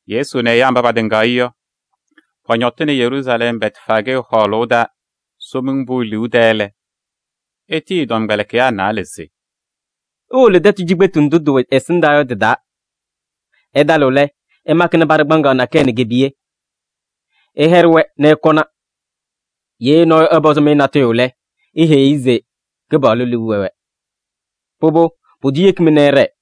Yesu nɛ ɛyaa mba patɩŋaɣ-ɩ yɔ, pɔñɔtɩnɩ Yeruusalɛm Bɛtfaajee hɔɔlʋʋ taa Somiŋ Pʋʋ liu tɛɛ lɛ, etiyi ɛ-tɔmkpɛlɩkɩyaa naalɛ se: “Iwolo tɛtʋ cikpetu ndʋ tɩwɛ ɛsɩndaa yɔ tɩ-taa. Ɩtalɩɣ lɛ, ɩmakɩnɩ paɖɩ kpaŋaɣ nakɛyɛ nɛ ke-piye. Ɩyɛɖɩ-wɛ nɛ ɩkɔna. Ye nɔɔyʋ ɛpɔzɩ-mɩ natʋyʋ lɛ, iheyi-i se: ‘Kɩpaɣlʋ liu wɛ-wɛ.’ Pʋbʋ, pʋdʋ yeki-mɩ nɛ ɩɖɛɛ.”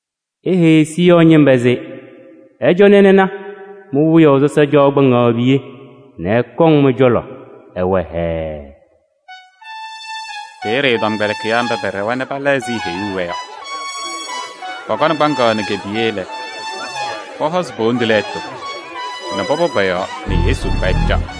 “Iheyi Siiyɔɔ ñɩma se: ɩcɔnɩ ɩna, mi-wiyaʋ sɔsɔ caɣ kpaŋaɣ nɛ ke-piye nɛ ɛkɔŋ mɩ-cɔlɔ, ɛwɛ hɛɛɛ.” Peeye ɛ-tɔmkpɛlɩkɩyaa mba pɛɖɛwa nɛ pala ɛzɩ eheyuu-wɛ yɔ. Pɔkɔnɩ kpaŋaɣ nɛ ke-piye lɛ, pɔhɔzɩ po-wondu lɛɛtʋ nɛ pɔpɔ pɔ-yɔɔ nɛ Yesu kpa ɛcaɣ.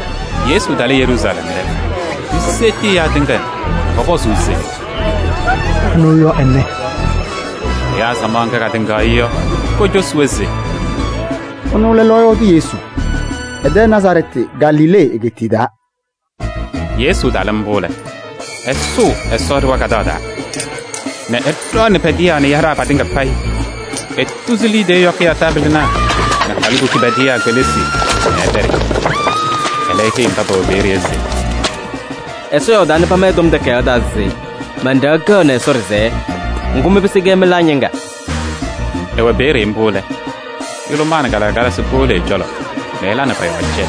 Yesu talɩ Yeruusalɛm lɛ, piseɣti ɛyaa tɩŋa nɛ pɔpɔzʋʋ se: “Anɩ yɔ ɛnɛ?” Ɛyaa samaɣ ŋga katɩŋaɣ-ɩ yɔ, kocosi-wɛ se: “Ɛnʋ lɛ lɔɔyaɣ tʋ Yesu, ɛ-tɛ Nazarɛɛtɩ Galilee egeetiye taa.” Yesu talɩ mbʋ lɛ, ɛsʋʋ Ɛsɔ ɖɩɣa kadaɣ taa nɛ ɛɖɔɔnɩ pɛdɩyaa nɛ yaɖaa patɩŋa payɩ. Etuzi liidiye yɔkɩyaa taabɩlɩnaa nɛ halikukunaa pɛdɩyaa kpelisi nɛ ɛpɛɖɩ. Ɛlɛ eheyi mba pɛwɛ peeye yɔ se: “Ɛsɔ yɔɔdaa nɛ pama ɛ-Tɔm Takayaɣ taa se: ‘Man-ɖɩɣa kɛɣnɩ Ɛsɔ ɖɩsɛyɛ.’ Ŋgʋ, mɩ mɩpɩsɩ-kɛ mɩlaa ñɩŋga.” Ɛwɛ peeye mbʋ lɛ, yʋlʋmaa nɛ kalɩkalasɩ powolo ɛ-cɔlɔ nɛ ɛla nɛ pɔ-yɔɔ cɛ.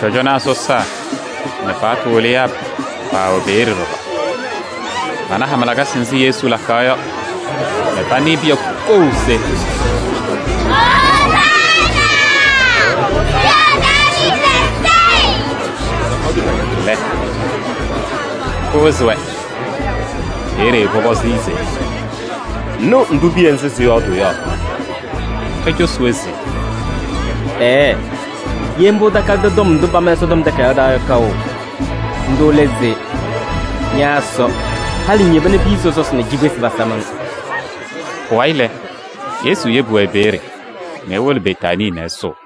Cɔjɔnaa sɔsaa nɛ paɣtʋ wɩlɩyaa paawɛ peeye ɖɔɖɔ. Pana hama lakasɩ nzɩ Yesu lakaɣ yɔ nɛ panɩɩ piya kou se: “Ozaana! Wiyaʋ Daaviidi Sayɩ” lɛ, pɩwɩzɩ-wɛ. Peeye pɔpɔzɩ-ɩ se: “Ŋnɩɣ ndʋ piya nzɩ sɩyɔɔdʋʋ yɔ?” Ecosi-wɛ se: “Ɛɛɛ! Ye mbʋ ɩtakalɩdɩ tɔm ndʋ pama Ɛsɔtɔm Takayaɣ taa yɔ kaʋ? Ndʋ lɛ se: ‘Ña Ɛsɔ, halɩ ŋyeba nɛ piya sɔsɔsɩ nɛ cikpesi pasam-ŋ.’” Pʋwayɩ lɛ, Yesu yebi-wɛ peeye nɛ ewolo Betaanii nɛ ɛsʋʋ.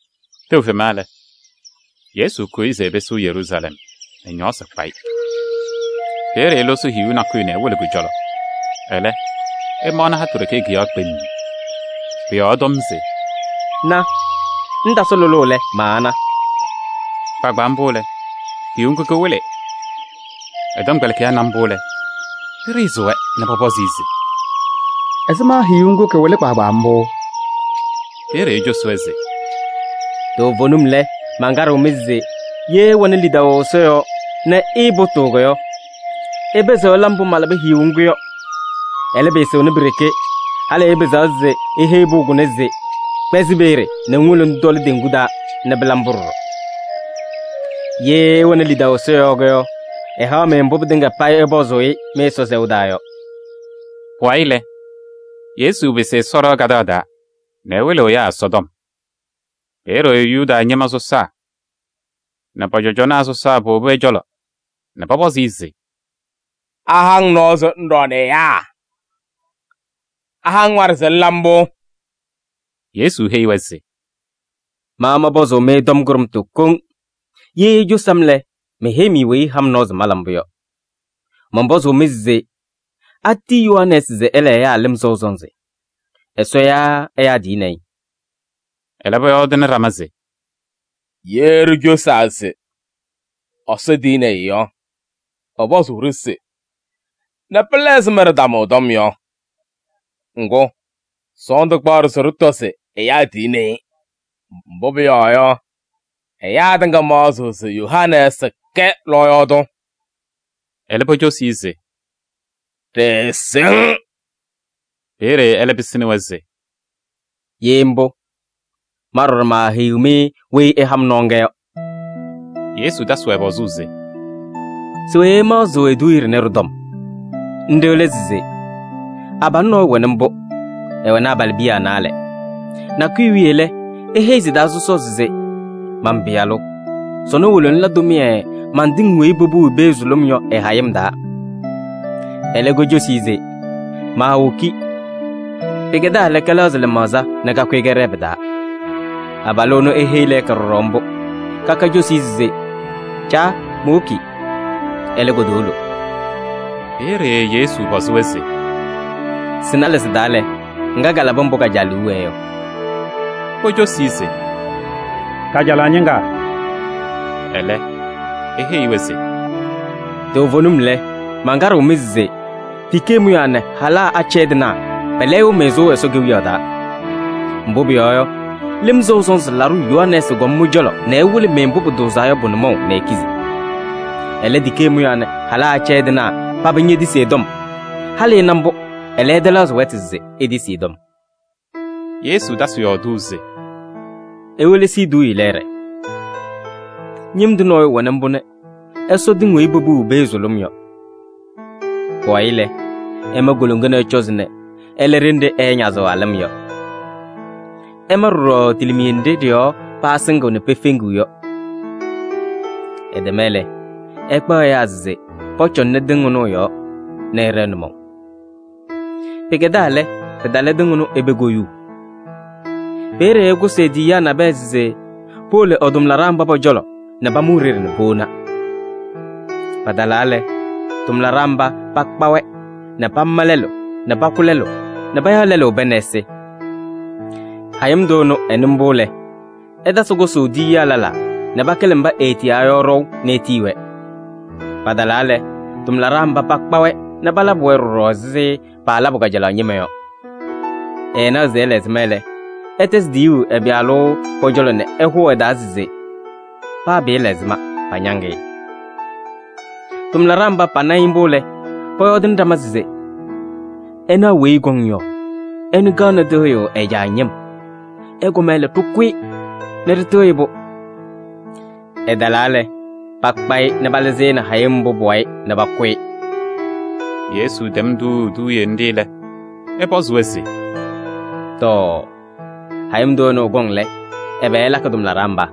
Tɛʋ fema lɛ, Yesu kʋyɩ se ɛpɩsɩɣ Yeruusalɛm nɛ ñɔɔsɩ kpa-ɩ. Peeye elosi hiyuu nakʋyʋ nɛ ewolo kʋ-cɔlɔ, ɛlɛ, ɛmaɣnɩ hatʋ ɖeke kʋ-yɔɔ kpemm. Pʋ-yɔɔ ɛtɔm se: “Ña! Ŋtasɩ lʋlʋʋ lɛ, maana!” Kpaagbaa mbʋ lɛ, hiyuu ŋgʋ kɩwɩlɩ. Ɛ-tɔmkpɛlɩkɩyaa na mbʋ lɛ, pɩɖɩɣzɩ-wɛ nɛ pɔpɔzɩ-ɩ se: “Ɛzɩma hiyuu ŋgʋ kɩwɩlɩ kpaagbaa mbʋ?” Peeye ecosi-wɛ se: “Toovenim lɛ, mankaɖɩɣ-mɩ se ye ɩwɛnɩ lidaʋ Ɛsɔ yɔɔ nɛ ɩɩpʋtʋʋ yɔ, ɩpɩzɩɣ ɩla mbʋ malabɩ hiyuu ŋgʋ yɔ. Ɛlɛ, pɩɩsɩɣnɩ pi-ɖeke, halɩ ɩpɩzaɣ se iheyi pʋʋ kʋnɛ se: ‘Kpɛzɩ peeye nɛ ŋwolo ŋtɔlɩ teŋgu taa’ nɛ pɩla mbʋ ɖɔɖɔ. Ye ɩwɛnɩ lidaʋ Ɛsɔ yɔɔ yɔ, ɛhaɣ-mɩ mbʋ pɩtɩŋa payɩ ɩpɔzʋʋ-ɩ mɩ-Ɛsɔ sɛʋ taa yɔ.” Pʋwayɩ lɛ, Yesu pɩsɩ Ɛsɔ ɖɩɣa kadaɣ taa nɛ ɛwɩlɩɣ ɛyaa Ɛsɔtɔm. Peeye Yuda ñɩma sɔsaa nɛ pɔ-cɔjɔnaa sɔsaa powobi ɛ-cɔlɔ nɛ pɔpɔzɩ-ɩ se: “Aha-ŋ nɔɔ se ŋɖɔɔnɩ ɛyaa? Aha-ŋ waɖɛ se ŋla mbʋ?” Yesu heyi-wɛ se: “Ma mɔnpɔzʋʋ-mɩ tɔm kʋɖʋmtʋ koŋ, ye icosi-m lɛ, meheyi-mɩ weyi ɛha-m nɔɔ se mala mbʋ yɔ. Mɔnpɔzʋʋ-mɩ se: atiyi Yohanɛɛsɩ se ɛla ɛyaa lɩm sɔʋ sɔnzɩ? Ɛsɔ yaa ɛyaa tiyini-i?” Ɛlɛ, pɔyɔɔdɩnɩ ɖama se: “Ye ɖicosaa se: ‘Ɛsɔ tiyini-i’ yɔ, ɛpɔzʋʋ-ɖʋ se: ‘Nɛ pɩla ɛzɩma ɖɩtamʋ ɛ-tɔm yɔ?’ Ŋgʋ, sɔɔndʋ kpaɣ-ɖʋ se ɖɩtɔ se: ‘Ɛyaa tiyini-i,’ mbʋ pʋyɔɔ yɔ, ɛyaa tɩŋa maɣzɩɣ se Yohanɛɛsɩ kɛ lɔɔyaɣ tʋ.” Ɛlɛ pocosi-i se: “Ɖɩɩsɩŋ.” Peeye ɛlɛ pɩsɩnɩ-wɛ se: “Ye mbʋ, ma ɖɔɖɔ maaheyiɣ-mɩ weyi ɛha-m nɔɔ ŋga yɔ.” Yesu tasɩ-wɛ pɔzʋʋ se: “Se we ɩmaɣzɩɣ eduuye ɖɩnɛ ɖɩ-tɔm? Nɖɩ lɛ se: abalʋ nɔɔyʋ wɛnɩ mbʋ, ɛwɛnɩ abalɩbiya naalɛ. Nakʋyʋ wiye lɛ, eheyi sɩ-taa sɔsɔɔ se: ‘Man-pɩyalʋ! Sɔnɔ wolo ŋla tʋmɩyɛ man-tɩŋ weyi popuu i-pee sʋlʋm yɔ ɩ-hayɩm taa.’ Ɛlɛ kocosi-i se: ‘Maawoki.’ Pɩkɛdaa lɛ, kɛlɛɣzɩ lɩmaɣza nɛ kakʋyɩ kɛɖɛɛ pɩ-taa. Abalʋ ɛnʋ eheyi lɛɛka ɖɔɖɔ mbʋ. Kaka cosi-i se: ‘Caa, mowoki.’ Ɛlɛ, kotowolo.” Peeye Yesu pɔzɩ-wɛ se: “Sɩ-naalɛ sɩ-taa lɛ, ŋga kalabɩ mbʋ ka-caa liu wɛɛ yɔ?” Pocosi-i se: “Kajalaɣ ñɩŋga.” Ɛlɛ eheyi-wɛ se: “Toovenim lɛ, mankaɖɩɣ-mɩ se tikee mʋyaa nɛ halaa mba pɛpɛdɩɣ pa-tɩ yɔ, pɛlɛyɩɣ-mɩ sʋʋ Ɛsɔ Kewiyaɣ taa. Mbʋ pʋyɔɔ yɔ, Lɩm Sɔʋ Sɔnzɩ Laɖʋ Yohanɛɛsɩ kɔm mɩ-cɔlɔ nɛ ɛwɩlɩ-mɩ mbʋ pʋtʋʋzaa yɔ pʋ-nʋmɔʋ nɛ ikizi. Ɛlɛ, tikee mʋyaa nɛ halaa mba pɛpɛdɩɣ pa-tɩ yɔ, paba ñetisi ɛ-tɔm. Halɩ ɩna mbʋ, ɛlɛ ɩtɛlɛɣzɩ wɛtʋ se itisi ɛ-tɔm.” Yesu tasɩ yɔɔdʋʋ se: “Iwelesi eduuye lɛɛɖɛ: ñɩm tʋ nɔɔyʋ wɛnɩ mbʋ nɛ ɛsɔ tɩŋ weyi popuu i-pee sʋlʋm yɔ. Pʋwayɩ lɛ, ɛma koloŋa nɛ ɛcɔzɩ nɛ ɛla ɖenɖe ɛɛñazɩɣ a-lɩm yɔ. Ɛma ɖɔɖɔ tilimiye nɖɩ ɖɩ-yɔɔ pasɩŋɩɣ nɛ pefeŋiɣ yɔ. Ɛtɛma lɛ, ɛkpaɣ ɛyaa se pɔcɔŋnɩ tɩŋ ɩnʋ ɩ-yɔɔ nɛ ɛɖɛɛ nʋmɔʋ. Pɩkɛdaa lɛ, pɩtalɩ tɩŋ ɩnʋ i-pee koyuu. Peeye ɛkʋsɩ e-tiyiyaa nabɛyɛ se powolo ɛ-tʋmlaɖaa mba pɔ-cɔlɔ nɛ pamʋ e-ɖeɖe nɛ powona. Patalaa lɛ, tʋmlaɖaa mba pakpa-wɛ nɛ pama lɛlʋ nɛ pakʋ lɛlʋ nɛ payaɣ lɛlʋ pɛɛ nɛ ɛsɩ. Hayɩm tʋ ɛnʋ ɛnɩ mbʋ lɛ, ɛtasɩ kʋsʋʋ tiyiyaa lɛlaa nɛ pakɩlɩ mba eetiyaa yɔ ɖɔʋ nɛ etiyi-wɛ. Patalaa lɛ, tʋmlaɖaa mba pakpa-wɛ nɛ palabɩ-wɛ ɖɔɖɔ ɛzɩ paalabʋ kajalaɣ ñɩma yɔ. Ɛɛnaɣ se ɛla ɛzɩma lɛ, ɛtɛzɩ tiyuu ɛ-pɩyalʋ pɔ-cɔlɔ nɛ ɛhʋʋ ɛ-taa se: ‘Paa pɩɩla ɛzɩma, pañaŋ-ɩ.’ Tʋmlaɖaa mba pana-ɩ mbʋ lɛ, pɔyɔɔdɩnɩ ɖama se: ‘Ɩnaɣ weyi ɛkɔŋ yɔ, ɛnʋ kaɣnɩ tɩɣyʋʋ ɛ-caa ñɩm. Ɛkɔma lɛ, ɖɩkʋ-ɩ nɛ ɖɩtɩɣyɩ-pʋ!’ Ɛtalaa lɛ, pakpa-ɩ nɛ palɩzɩ-ɩ nɛ hayɩm mbʋ pʋ-wayɩ nɛ pakʋ-ɩ.” Yesu tɛm tuuu eduuye nɖɩ lɛ, ɛpɔzɩ-wɛ se: “Tɔɔ! Hayɩm tʋ ɛnʋ ɛkɔŋ lɛ, ɛbɛ ɛlakɩ tʋmlaɖaa mba?”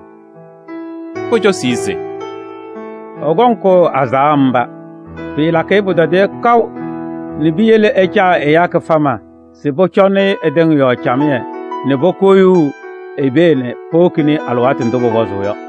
Pocosi-i se: “Ɛkɔŋ ɛkʋ azaɣa mba, pɩɩlakɩ-ɩ pʋtɔdɩyɛ kaʋ nɛ piyele ɛcaa ɛyaa kɩfama se pɔcɔnɩ-ɩ ɛ-tɩŋ yɔɔ camɩyɛ nɛ pokoyuu i-pee nɛ powokini-i alɩwaatʋ ndʋ pʋpɔzʋʋ yɔ.”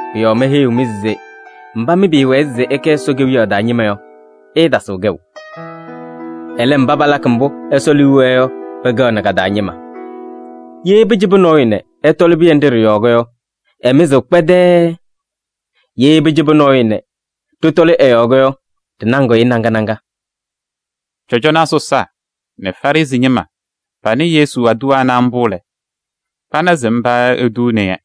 Pʋ-yɔɔ meheyiɣ-mɩ se: mba mɩ pɩɩwɛɛ se ɩkɛ Ɛsɔ Kewiyaɣ taa ñɩma yɔ, ɩɩtasɩɣ kɛʋ. Ɛlɛ, mba palakɩ mbʋ Ɛsɔ liu wɛɛ yɔ pɛkɛɣnɩ ka-taa ñɩma. [ Ye pɩcɩbɩ nɔɔyʋ nɛ ɛtɔlɩ pɩyɛ nɖɩ ɖɩ-yɔɔ yɔ, ɛmɩzɩɣ kpɛdɛɛɛ. Ye pɛcɩbɩ nɔɔyʋ nɛ ɖɩtɔlɩ ɛ-yɔɔ yɔ, ɖɩnaŋɩɣ-ɩ naŋa naŋa.]” Cɔjɔnaa sɔsaa nɛ Farɩsɩ ñɩma panɩ Yesu aduwa ana mbʋ lɛ, pana se mba etuuni-yɛ.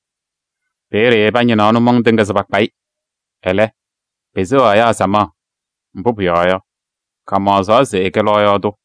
Peeye pañɩnaɣ nʋmɔŋ tɩŋa se pakpa-ɩ. Ɛlɛ, peseɣaɣ ɛyaa samaɣ, mbʋ pʋyɔɔ yɔ, kamaɣzaɣ se ɛkɛ lɔɔyaɣ tʋ.